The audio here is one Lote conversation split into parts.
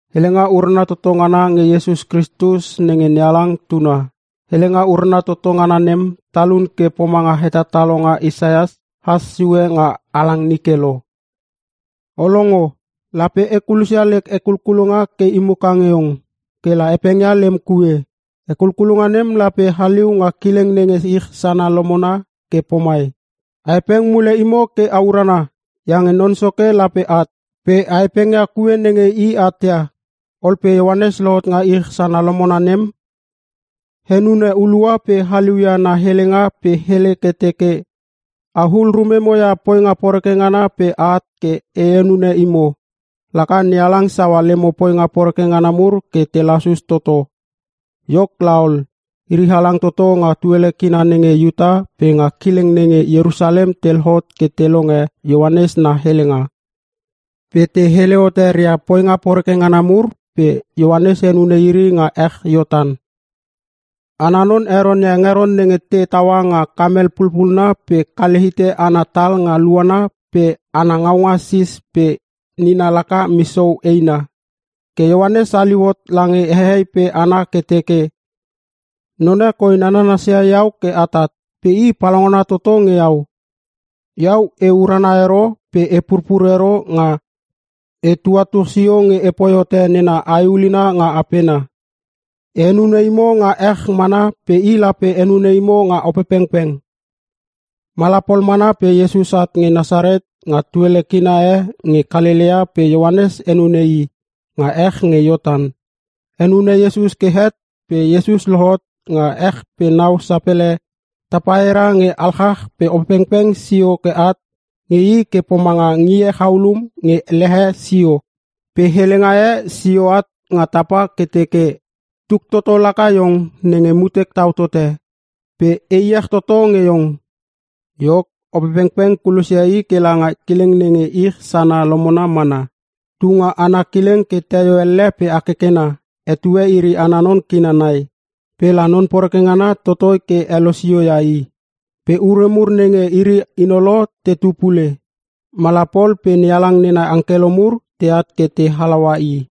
Helenga urana toto ngana nge Iesus Kristus nenge NeHalang tuna. Helenga urana toto ngana nem talun ke pomanga hetatalonga Isaias has sue nga halang nike lo. “O longo, lape e kulosia lek hekulkulonga ke i muka nge iong. kela hepengia lem kue. Hekulkulonga nem lape haliu nga kileng nenge ich sana lomona ke pomai, ‘A hepeng mule imo ke a urana iange Non Soke lape at. Pe a hepengia kue nenge i atia.’” Ol pe Ioanes lohot nga ich sana lomona nem, henune hulua pe haliu ia na helenga pe hele ke teke, “A hul rumemo ia poinga poreke ngana pe a at ke e henune imo, laka NeHalang saua lemo poinga poreke ngana mur ke te lasus toto.” Iok laol, iri halang toto nga tuele kina nenge Iuta pe nga kileng nenge Ierusalem te lohot ke te longe Ioanes na helenga. Pe te hele hote ria poinga poreke ngana mur pe Ioanes henune iri nga ech Iortan. Ana non heronia hengeron nenge te taua nga kamel pulpunna pe kale hite ana tal nga luana pe ana ngaunga sis pe nina laka misou eina. Ke Ioanes haliu hot lange hehei pe hana ke teke, “Non e koi nanasia iau ke atat pe i palaungana toto nge iau. Iau e urana ero pe e purpur ero nga e tuatuch sio nge epoi hote nena ae ulina nga apena. E henune imo nga ech mana pe i lape henune imo nga Opepengpeng.” Mala pol mana pe Iesus at nge Nasaret nga tuele kina e nge Kalelea pe Ioanes henune i nga ech nge Iortan. Henune Iesus ke het pe Iesus lohot nga ech pe nau sapele tapaira nge alchach pe Opepengpeng sio at nge i ke pomanga ngie chaulum nge lehe sio. Pe helenga e sio at nga tapa ke teke, “Tuk toto laka iong nenge mutek tau tote. Pe e iech toto nge iong.” Iok, Opepengpeng kulosia i kela nga kileng nenge ich sana lomona mana. Tu nga ana kileng ke teio elle pe hakekena (etue iri ana non kina nai) pe la Non Poreke ngana totoi ke helosio ia i. Pe ure mur nenge iri hinolo tetu pule. Mala pol pe NeHalang nena angkelo mur teat ke te halaua i.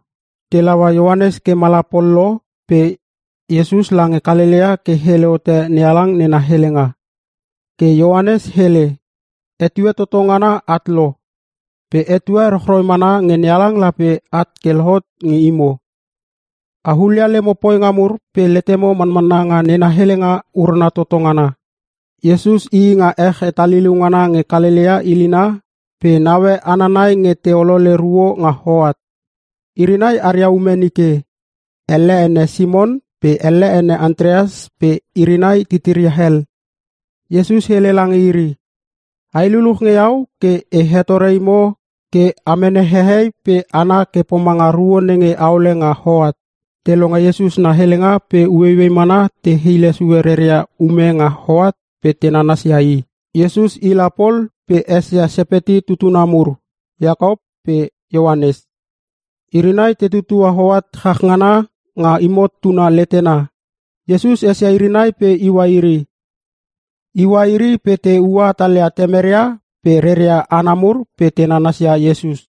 Te laua Ioanes ke mala pol lo pe Iesus lange Kalelea ke hele hote NeHalang nena helenga. Ke Ioanes hele, “Etue toto ngana at lo. Pe etue rochroi mana nge NeHalang lape at ke lohot nge imo! A hulia lemo poinga mur pe letemo manmanna nga nena helenga urana toto ngana!” Iesus ii nga ech hetaliliu ngana nge Kalelea ilina, pe naue hana nai nge te olole ruo nga hoat. Iri nai aria ume nike, elle ene Simon pe elle ene Antrias pe iri nai titiria hel. Iesus hele lange iri, “Ai luluch nge iau ke e hetore imo ke a mene hehei pe hana ke pomanga ruo nenge aole nga hoat.” Te longe Iesus na helenga pe ueiuei mana te hile sue reria ume nga hoat pe te nanasia i. Iesus i la pol pe esia Sepeti tutuna mur Iakop pe Ioanes. Iri nai te tutua hoat chach ngana nga himot tuna letena. Iesus esia iri nai pe iua iri. Iua iri pe te ua hatalia temeria pe reria hana mur pe te nanasia Iesus.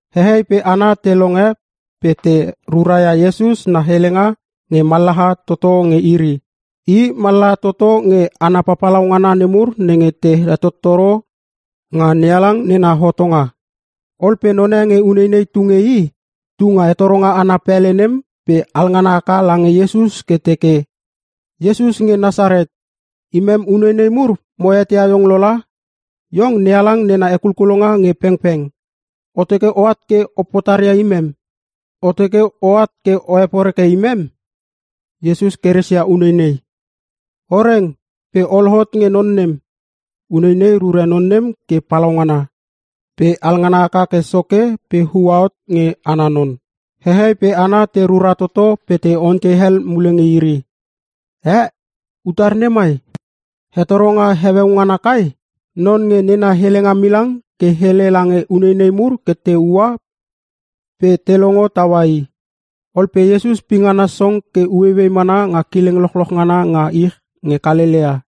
Hehei pe hana te longe pe te ruraia Iesus na helenga nge mallaha toto nge iri. I mallaha toto nge hana papalau ngana nemur nenge te hetottoro nga NeHalang nena hotonga. Ol pe none nge uneinei tu nge i, tu nga hetoronga ana pele nem pe alngana haka lange Iesus ke teke, “Iesus nge Nasaret, Imem uneinei mur mo eteia iong lo la! Iong NeHalang nena hekulkulonga nge pengpeng. O teke oat ke o potaria imem? O teke oat ke o heporeke imem?” Iesus keresia uneinei, “O reng, pe o lohot nge non nem.” Uneinei rure non nem ke palaungana, pe alngana haka ke soke pe uahot nge ana non. Hehei pe hana te rura toto pe te ontei hel mule nge iri, “Ee! Utar nei mai? Hetoronga heueu ngana kai? Non nge nena helenga milang ke hele lange uneinei mur ke te ua pe te longo taua i.” Ol pe Iesus pingana song ke ueiuei mana nga kileng lochloch ngana nga ich nge Kalelea.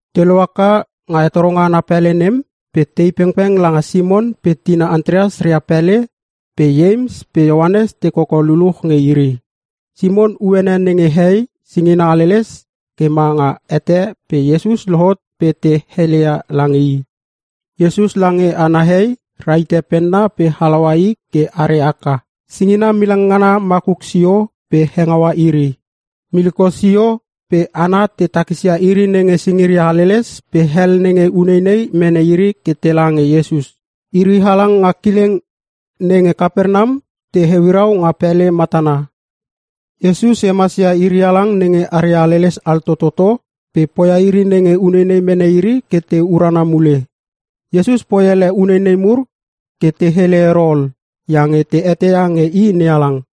Te lohaka nga hetoronga ana pele nem pe tei pengpeng langa Simon pe tina Antrias ria pele pe Ieims pe Ioanes te koko luluch nge iri. Simon uene nenge hei singina haleles ke ma nga hete pe Iesus lohot pe te heleia lange i. Iesus lange ana hei, rahite penna pe halaua i ke are aka. Singina milang ngana makuk sio pe hengaua iri. Miliko sio, pe hana te takisia iri nenge singiria haleles pe hel nenge uneinei mene iri ke tela nge Iesus. Iri halang nga kileng nenge Kapernam te heuirau nga pele matana. Iesus hemas ia iri halang nenge aria haleles altototo pe poia iri nenge uneinei mene iri ke te urana mule. Iesus poi ele uneinei mur ke te hele ero ol iange te eteia nge i NeHalang.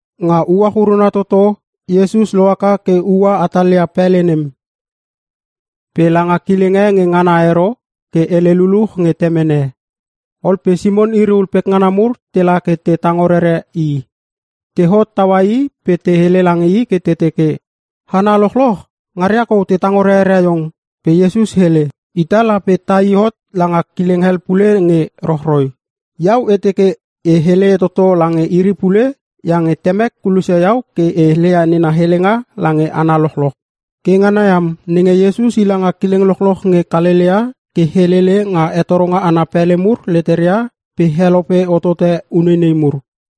Nga uach uruna toto Iesus lohaka ke ua hatalia pele nem. Pe langa kileng e nge ngana ero, ke hele luluch nge Temene. Ol pe Simon iri ul pekngana mur tela ke te tango rere i. Te hot taua i pe te hele lange i ke te teke, “Hana lochloch ngaria kou te tango rerere iong.” Pe Iesus hele, “Ita lape tai hot langa kileng hel pule nge rochroi. Iau e teke e hele toto lange iri pule iange Temek kulosia iau ke e heleia nena helenga lange hana lochloch.” Ke ngana iam nenge, Iesus i langa kileng lochloch nge Kalelea, ke helele nga hetoronga ana pele mur leteria pe helope hotote uneinei mur.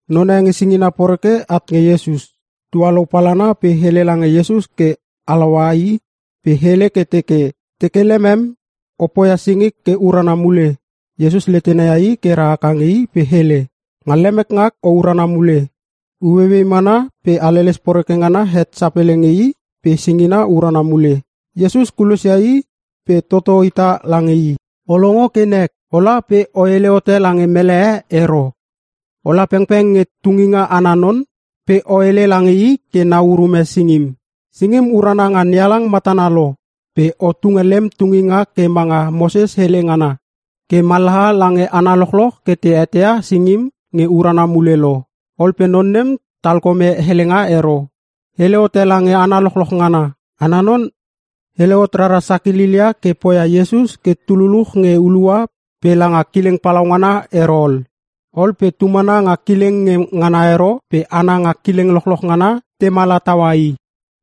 Non e nge singina poreke at nge Iesus, tualou palana pe hele lange Iesus ke halaua i pe hele ke teke, “Teke lemem, o poia singik ke urana mule.” Iesus letena ia i ke ra haka nge i pe hele, “Nga lemek ngak o urana mule!” Ueiuei mana pe haleles poreke ngana het sapele nge i pe singina urana mule. Iesus kulosia i pe toto hita lange i, “O longo ke nek! Ola pe o hele hote lange mele e ero. Ola pengpeng nge tunginga ana non pe o hele lange i ke nau urume singim. Singim urana nga NeHalang matana lo pe o tunge lem tunginga ke manga Moses hele ngana, ke mallaha lange hana lochloch ke te eteia singim nge urana mule lo.” Ol pe non nem talkome helenga ero. Hele hote lange hana lochloch ngana. Ana non hele hot rara sakililia ke poia Iesus ke tu luluch nge hulua pe langa kileng palaungana ero ol. Ol pe tu mana nga kileng nge ngana ero pe hana nga kileng lochloch ngana te mana taua i.